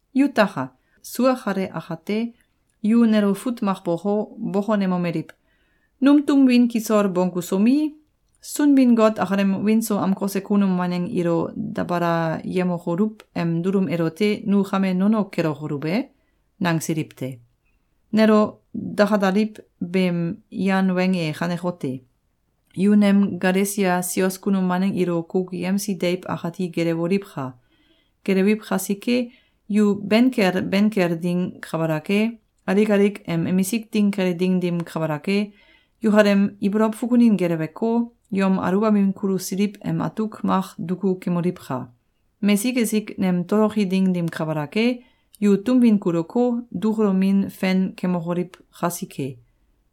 Yutaka! Sua kale akate, yu nelo fut mak boko, bokonemomeliw: “Num tum win kisol bonggusomi, Sunbin-Got akalem wiin so amkose kunum waneng ilo dabalayemokoluw em dulum elote nu kame nono kelokoluw e?”, nangsiliw te. Nelo dakalaliw beem yan weng e kanekote: Yu nem Galesia sios kunum waneng ilo kukuyemsi deiw akati gelewoliwka! Gelewiw kasike, yu ben kel ben kel ding kabalak e, alik alik em emisik ding kele ding dim kabalak e, yukalem ibolow fukunin geleweko, yom aluwbamin kulusiliw em atuk mak duku kemoliwka! Mesik esik nem toloki ding dim kabalak e, yu tum win kuluko, dukulomin fen kemokoliw kasike.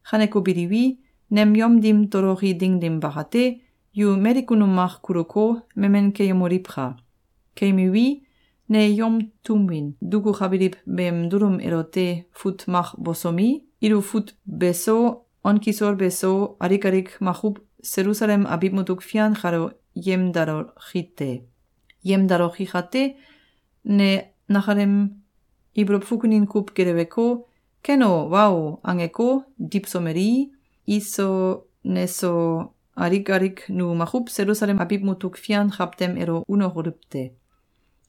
Kaneko biliwi, nem yom dim toloki ding dim bakate, yu mali kunum mak kuluko, memen keyemoliwka! Keyemiwi, ne yom tun win dukukabiliw beem dulum elote fut mak bosomi, ilo fut beso, on kisol beso, alik alik makuw Selusalem abiw mutuk fian kalo yemdaloki te. Yemdaloki kate, ne nakalem ibolow fukunin kuw geleweko, “Ken o, wa o!”, angeko, diwsomelii, iso neso, alik alik nu makuw Selusalem abiw mutuk fian kawtem elo unokoluw te.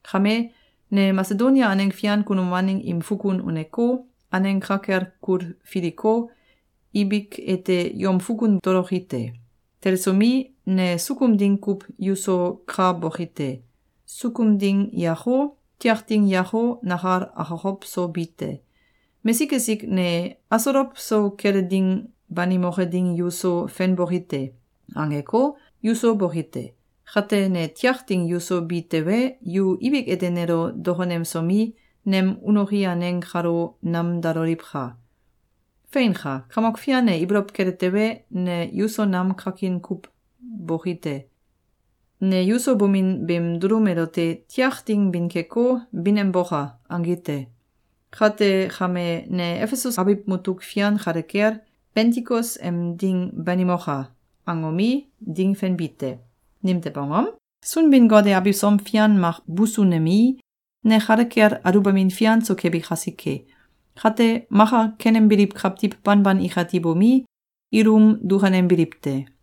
Kame, ne Masedonia aneng fian kunum waneng im fukun uneko, aneng ka kel kulfiliko, ibik ete yom fukun toloki te. Telesomi, ne sukum ding kuw yuso ka boki te. Sukum ding yako, tiak ding yako, nakal akokow so bi te. Mesik esik ne “Asolow so kele ding banimoke ding yuso fenboki te!”, angeko, yuso boki te. Kate, ne tiak ding yuso bi tewe, yu ibik ete nelo dokonemsomi, nem unoki aneng kalo namdaloliwka! Feinka! Kamok Fian e ibolow kele tewe, ne yuso nam kakin kuw boki te. Ne yuso bomin beem dulum elote “Tiak ding bin keko, bin em boka!”, angi te. Kate kame, ne Efesus abiw mutuk fian kale kel, “Bentikos em ding banimoka!”, angomi, ding fenbi te. Nimtew angom? Sunbin-Got e abisom fian mak busunemei, ne kale kel aluwbamin fian so kebi kasike. Kate, maka kenembiliw kawtiw banban ikati bomi, ilum dukanembiliw te.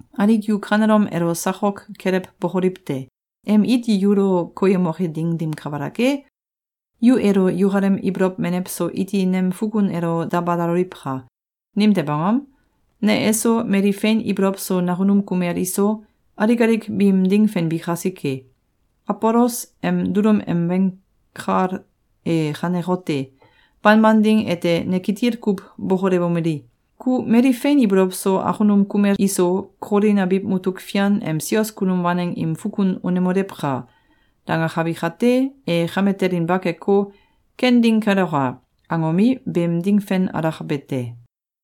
Alik yu kanelom elo sakok kelewbokoliw te! Em iti yulo koyemoke ding dim kabalak e, yu elo yukalem ibolow menew so iti nem fukun elo dabalaloliwka! Nimtew angom? Ne eso, mali fein ibolow so nakunum kumel iso, alik alik biim ding fenbi kasike. Abolos em dulum em weng kal e kanekote: Banban ding ete ne kitil kuw bokolewomeli: “Ku mali fein ibolow so akunum kumel iso Kolin abiw mutuk fian em sios kunum waneng im fukun unemolewka!”, dangakabi kate, e kame telinba keko, “Ken ding keloka!”, angomi, beem ding fen alakabe te.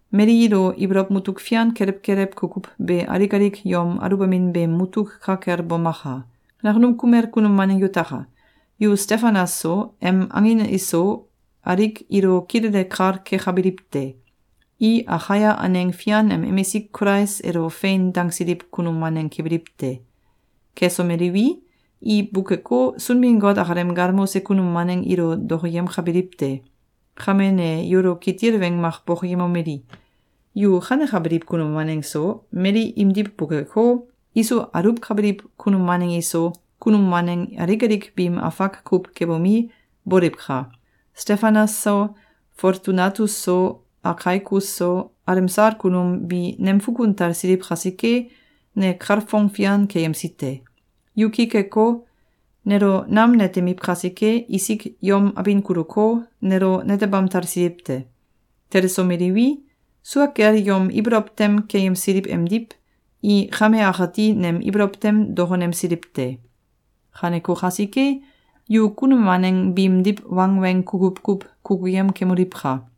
Mali ilo ibolow mutuk fian kelew kelew kukuw be alik alik yom aluwbamin beem mutuk ka kel bomaka! Nakunum kumel kunum waneng yutaka! Yu Stefanas so, em angin iso alik ilo kilele kal kekabiliw te. I Akaia aneng fian em emisik Kulais elo “Fein!”, dangsiliw kunum waneng kebiliw te. Kesomeliwi, i bukeko, Sunbin-Got akalem galmose kunum waneng ilo dokoyemkabiliw te. Kame ne yulo kitil weng mak bokoyemomeli: Yu kanekabiliw kunum waneng so, mali imdiw bukeko, iso aluwkabiliw kunum waneng iso, kunum waneng alik alik biim afak kuw kebomi, boliwka! Stefanas so, Foltunatus so, Akaikus so, alemsal kunum bi nem fukun talsiliw kasike, ne kalfong fian keyemsi te. Yu ki keko, nelo nam netemiw kasike, isik yom abin kuluko, nelo netebam talsiliw te. Telesomeliwi, sua kel yom ibolow tem keyemsiliw emdiw, i kame akati nem ibolow tem dokonemsiliw te. Kaneko kasike, yu kunum waneng biimdiw wangweng kukuw kuw kukuyem kemoliwka!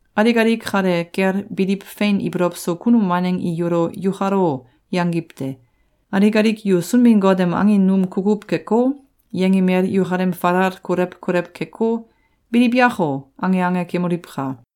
Alik alik kale kel biliw fein ibolow so kunum waneng i yulo “Yukal o!”, yangiw te. Alik alik yu Sunbin-Got em angin num kukuw keko, yengimel yukalem falal kolew kolew keko, “Biliw yako!”, ange ange kemoliwka!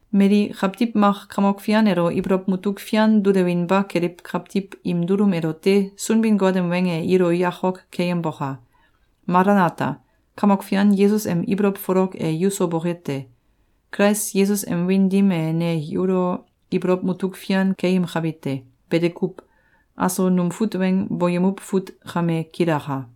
Mali kawtiw mak Kamok Fian elo ibolow mutuk fian dulewinba keliw kawtiw im dulum elote Sunbin-Got em weng e ilo yakok keyemboka! Malanata! Kamok Fian Yesus em ibolow folok e yuso boke te! Kulais Yesus em wiin dim e ne yulo ibolow mutuk fian keyemkabi te. Bete kuw. Aso num fut weng boyemuw fut kame kilaka.